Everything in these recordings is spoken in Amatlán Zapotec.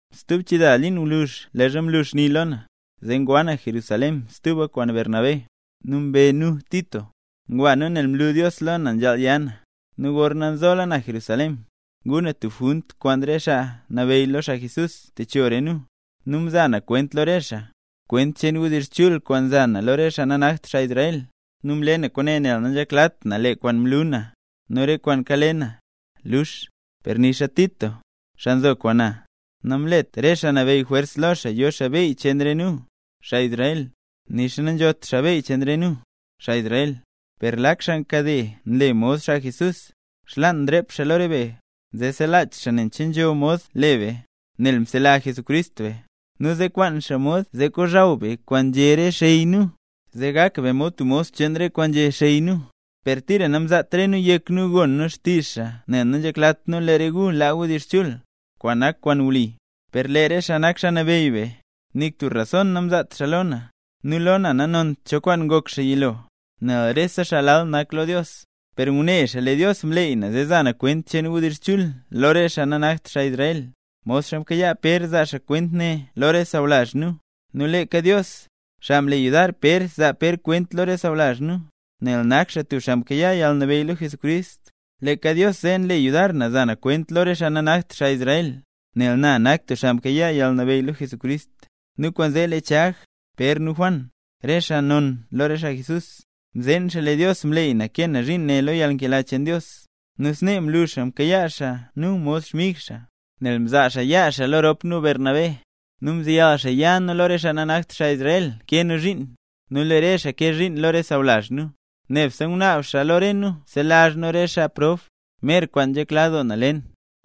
Stub chida liin gwluzh leezha mlu xni lo na, zee ngwa na Jerusalén stuba kwaan Bernabé, nu mbe nu Tito. Ngwa nu nel mlu Dios lo na nzhaal ya na. Nu gorna nzola na Jerusalén, nguu na tub junt kwaan re xaa nabeyy lo xaa Jesús, techo re nu, nu mza na kwent lo re xaa, kwent cheen wdizh chul kwaan nza na lo re xaa nanakt xaa Israel. Nu mle na kwaane nel nanzheklat na lee kwaan mlu na, nu re kwaan kale na, luux. Per nixa Tito, xaa nzo kwaan na, namlet re xaa nabeyy jwers lo xaa yo xaa beyy cheen re nu, xaa Israel, nixa nanzhot xaa beyy cheen re nu, xaa Israel. Per lak xaa nkade, nu nle mod xaa Jesús, xlaan mrep xaa lo re be, nze selach xaa nen cho kwaan nzho mod le be, nel msela Jesucrist be; nu zee mkwaan xaa mod le xaa zee kozhaw be kwaan nzhé re xey nu, zee gak be mod tub mos cheen re kwaan nzhé xey nu. Per tira namzaat re nu yek nu gon xtizh xaa nel nanzheklat nu lee re gu laa wdizh chul, kwaan nak kwaan wli. Per lee re xaa nak xaa nabeyy be, nik tub rason namzaatra xaa lo na. (Nu lo na nanont cho kwaan ngok xaa yilo, nel rese xaa lal nak lo Dios.) Per ngune xaa lee Dios mleey na za na kwent cheen wdizh chul lo re xaa nanakt xaa Israel, modxa mkayaa Pér zaa xaa kwent ne lo re sawlazh nu. Nu leeka Dios, xaa mle yudar Pér zaa Pér kwent lo re sawlazh nu, nel nak xaa tub xaa mkayaa yalnabeyy lo Jesucrist, leeka Dios zee, nle yudar na za na kwent lo re xaa nanakt xaa Israel, nel na nak tub xaa mkayaa yalnabeyy lo Jesucrist. Nu kwaanzee lee Chag, Pér nu Juan, re xaa non lo re xaa Jesús, mzeen xaa lee Dios mleey na kee na zhiin ne lo yalnkela cheen Dios. Nu snee mlu xaa mkayaa xaa nu mod xmig xaa, nel mzaa xaa yaa xaa lo rop nu Bernabé, nu mzeyal xaa ya nu lo re xaa nanakt xaa Israel kee nu zhiin, nu lee re xaa kee zhiin lo re sawlazh nu. Nebse ngunaab re xaa lo nu selazh nu re xaa prob, mer kwaan nzhekla doo na le na.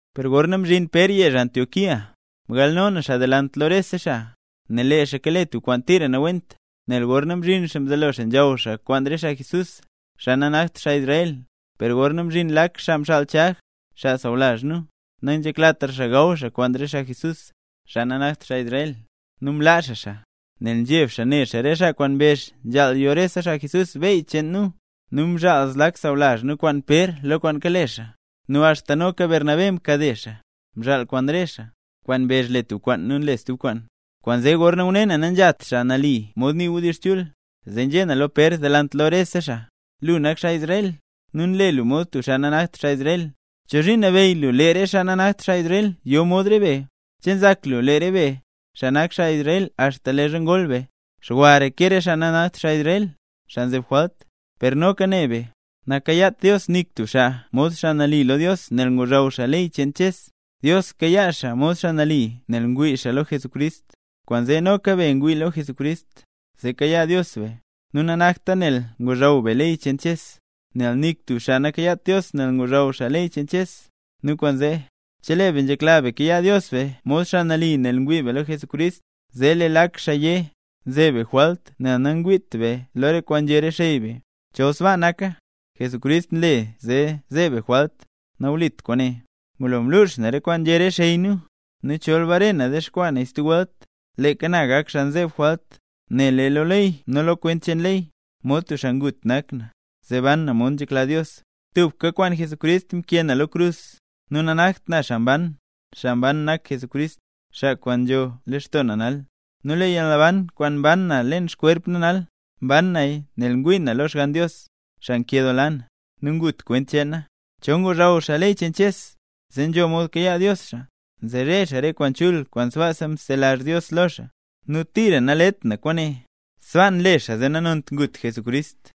Per gorna mzhin Pér yezh Antioquía, mgalno na xaa delant lo rese xaa, nel lee xaa kale tub kwaan tira nawent. Nel gorna mzhin xaa mzelo xaa nzhaw xaa kwaan re xaa Jesús, xaa nanakt xaa Israel. Per gorna mzhin lak xaa mxaal Chag, xaa sawlazh nu, nanzheklatra xaa gaw xaa kwaan re xaa Jesús, xaa nanakt xaa Israel; nu mlaa xaa xaa, nel mzheb xaa ne xaa re xaa kwaan mbezh nzhaal yo rese xaa Jesús beyy cheen nu. Nu mzhaal lak sawlazh na kwaan Pér lo kwaan kale xaa, nu axta noka Bernabé mkade xaa, mzhaal kwaan re xaa, xaa kwaan mbezh le tub kwaan nu nle stub kwaan. Kwaanzee gorna ngune na nanzhat xaa nali mod nii wdizh chul, zee nzhé na lo Pér delant lo rese xaa: “Lu nak xaa Israel, nu nle lu mod tub xaa nanakt xaa Israel. ¿Chozhiin nabeyy lu lee re xaa nanakt xaa Israel yo mod rop be? ¿Che nzak lu, lee re be, xaa nak xaa Israel axta leezha ngol be, xwara ke re xaa nanakt xaa Israel, xaa nzeb jwalt? Per noka ne be, nakayaat Dios nik tub xaa mod xaa nali lo Dios nel ngozhaw xaa ley cheen Ches; Dios kayaa xaa mod xaa nali nel ngwii xaa lo Jesucrist. Kwaanzee noka be ngwii lo Jesucrist, zee kayaa Dios be. Nu nanakta nel ngozhaw be ley cheen Ches, nel nik tub xaa nakayaat Dios nel ngozhaw xaa ley cheen Ches. Nu kwaanzee, chelee be nzhekla be kayaa Dios be mod xaa nali nel ngwii be lo Jesucrist, zee lee lak xaa yé, nzeb be jwalt nel nangwiit be lo re kwaan nzhé re xey be. ¡Chol sbaa naka, Jesucrist nle zee zeeb be jwalt, nawlit kwaane!” Ngulo mlux na re kwaan nzhé re xey nu, nu chol bare na dexkwaa naya stub welt, leeka na ngak xaa nzeb jwalt. Nel lee lo ley nu lo kwent cheen ley, mod tub xaa ngut nak na, zee ban na mod nzhekla Dios. Tubka kwaan Jesucrist mkee na lo krus, nu nanakt na xaa mban, xaa mban nak Jesucrist, xaa kwaan nzho leen lextoo na nal. Nu lee yalnaban kwaan mban na leen xkwerp na nal, mban naya nel ngwii na lo Xgann Dios, xaa nkedoola na, nu ngut kwent cheen na. Chol ngozhaw xaa ley cheen Ches, zee nzho mod kayaa Dios xaa, nzere xaa re kwaan chul kwaan sbaasa mzelazh Dios lo xaa, ¡nu tira nalet na kwaane! Sbaa nle xaa zee nanont ngut Jesucrist.